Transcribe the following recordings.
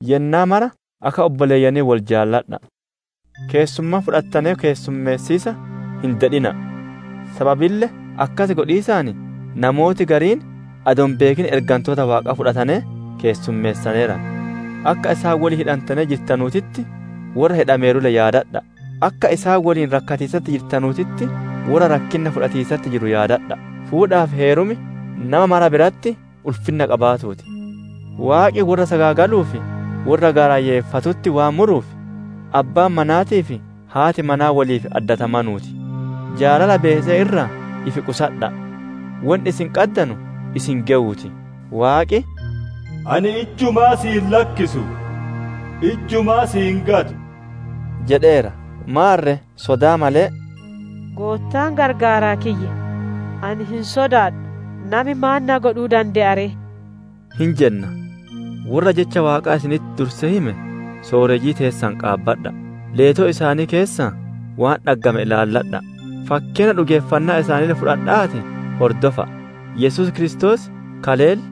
Yennaa mara akka obboleeyyanii wol jaaladha'a! Keessummaa fudhattanee keessummeessiisa hin dedhina'a; sababille akkas godhiisaan namooti gariin adoo hin beekin ergantoota Waaqaa fudhatanee keessummeessaneeran. Akka isaan woliin hidhantanee jirtanuutitti, worra hidhameeru yaadadha'a! Akka isaan woliin rakkatiisatti jirtanuutitti, worra rakkinna fudhatiisatti jiru yaadadha'a! Fuudhaa fi heerum nama mara biratti ulfinna qabaatuu ti; Waaqi worra sagaagaluu fi worra gaarayyeeffatutti waan muruuf, abbaan manaatii fi haati manaa woliif addatamanuu ti. Jaalala beese'ee irraa if qusadha'a; wonni isin qaddanu isin gewuu ti. Waaqi, «Ani ijjumaa si hin lakkisu, ijjumaa si hin gatu» jedheera. Maarre sodaa malee, «Goottaan gargaaraa kiyya, ani hin sodaadhu; nami maan na godhuu dande'a ree?» hin jenna. Worra jecha Waaqaa isinitti dursee hime sooreyyii teessan qaabadha'a! Leetoo isaanii keessaa waan dhaggame ilaala'a, fakkeenna dhugeeffannaa isaaniille fudhadha'aatii hordofa'a. Yesuus Kiristoos kaleelle,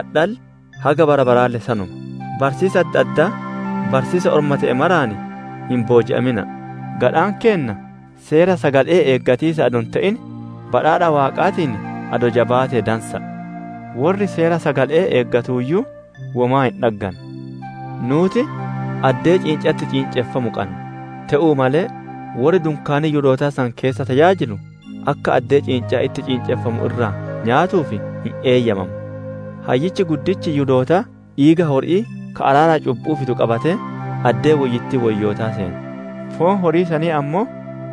adhaalle, haga bara baraalle sanuma! Barsiisa adda addaa, barsiisa orma te'e maraan hin booji'amina'a! Gadhaan keenna seera sagale'ee eeggatiisaan adoo hin te'in, badhaadha Waaqaatiin adoo jabaate dansa'a; worri seera sagale'ee eeggateeyyuu womaa hin dhagganne. Nuuti addee ciincaan itti ciinceffamu qanna; te'uu malee worri dunkaanii Yihudootaa san keessa tajaajilu akka addee ciincaan itti ciinceffamu irraa nyaatuuf hin eeyyamamu. Hayyichi guddichi Yihudootaa, dhiiga hori'ii ka araara cubbu'uu fidu qabatee addee woyyittii woyyootaa seena; foon horii sanii ammoo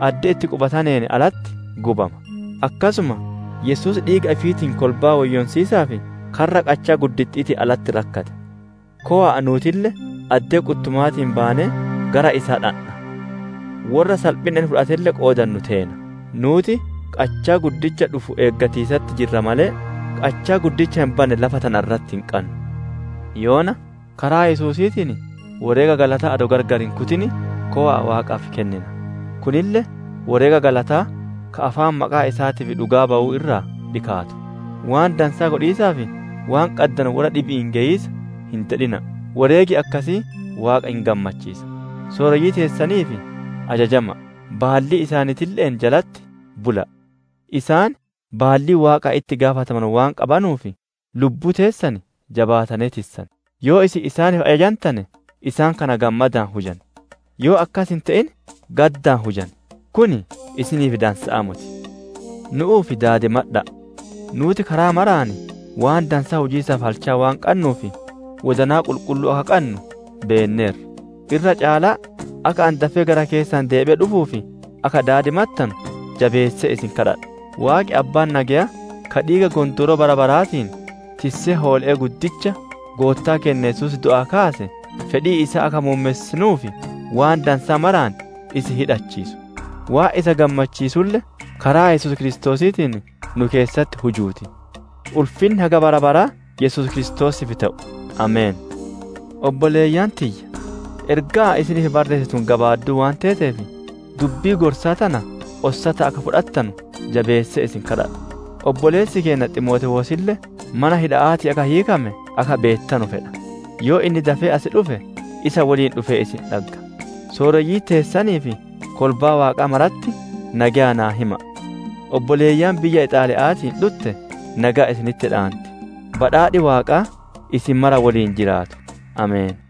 addee itti qubataneen alatti gubama. Akkasuma Yesuus dhiiga ifiitiin kolbaa woyyoonsiisaaf, karra qachaa gudda'aatiin alatti rakkate. Kowa'a nuutille addee quttumaatii baanee gara isaa dhandha; worra salphinna inni fudhatelle qoodannu teena. Nuuti qachaa guddicha dhufu eeggatiisatti jirra malee, qachaa guddicha hin banne lafa tana irratti hin qannu. Yoona, karaa Yesuusiitiin woreega galataa adoo gargar hin kutin, kowa'a Waaqaaf kennina. Kunille woreega galataa, ka afaan maqaa isaatiif dhugaa bawu irraa dhikaatu. Waan dansaa godhiisaa fi waan qaddanu worra dhibi'iin geyiisa hin dedhina'a! Woreegi akkasii Waaqa hin gammachiisa. Sooreyyii teessaniif ajajama'a; baallii isaaniitille'een jalatti bula'a; isaan baallii Waaqaan itti gaafatamanu waan qabanuuf, lubbuu teessan jabaatanee tissan; yoo isin isaaniif ajajantane, isaan kana gammadaan hujan; yoo akkas hin te'in, gaddaan hujan; kun isiniif dansa'aa moti. Nu'uuf daadimadha'a; nuuti karaa maraan waan dansaa hujiisaaf halchaa waan qannuuf, wodanaa qulqulluu akka qannu beenneerra. Irra caalaa akka ani dafee gara keessan deebi'ee dhufuuf akka daadimattanu, jabeessee isin kadhadha. Waaqi Abbaan nageyaa, ka dhiiga gondooroo bara baraatiin, tissee hoole'ee guddicha, Goottaa keenna Yesuus du'aa kaase, fedhii isaa akka muummessitanuuf waan dansaa maraan isin hidhachiisu; waan isa gammachiisulle, karaa Yesuus Kiristoosiitiin nu keessatti hujuu ti. Ulfinni haga bara baraa Yesuus Kiristoosiif te'u! Ameen. Obboleeyyan tiyya! Ergaan ani isiniif barreesse tun gabaadduu waan teeteef, dubbii gorsaa tana ossataan akka fudhattanu jabeessee isin kadhadha. Obboleessi keenna Ximootewoosille mana hidha'aatii akka hiikame akka beettanu fedha. Yoo inni dafee as dhufe, isa woliin dhufee isin dhagga. Sooreyyii teessanii fi kolbaa Waaqaa maratti nageya naa hima'a! Obboleeyyan biyya Ixaaliya'aatii dhutte nageya isinitti dhaanti. Badhaadhi Waaqaa isin mara woliin jiraatu! Ameen.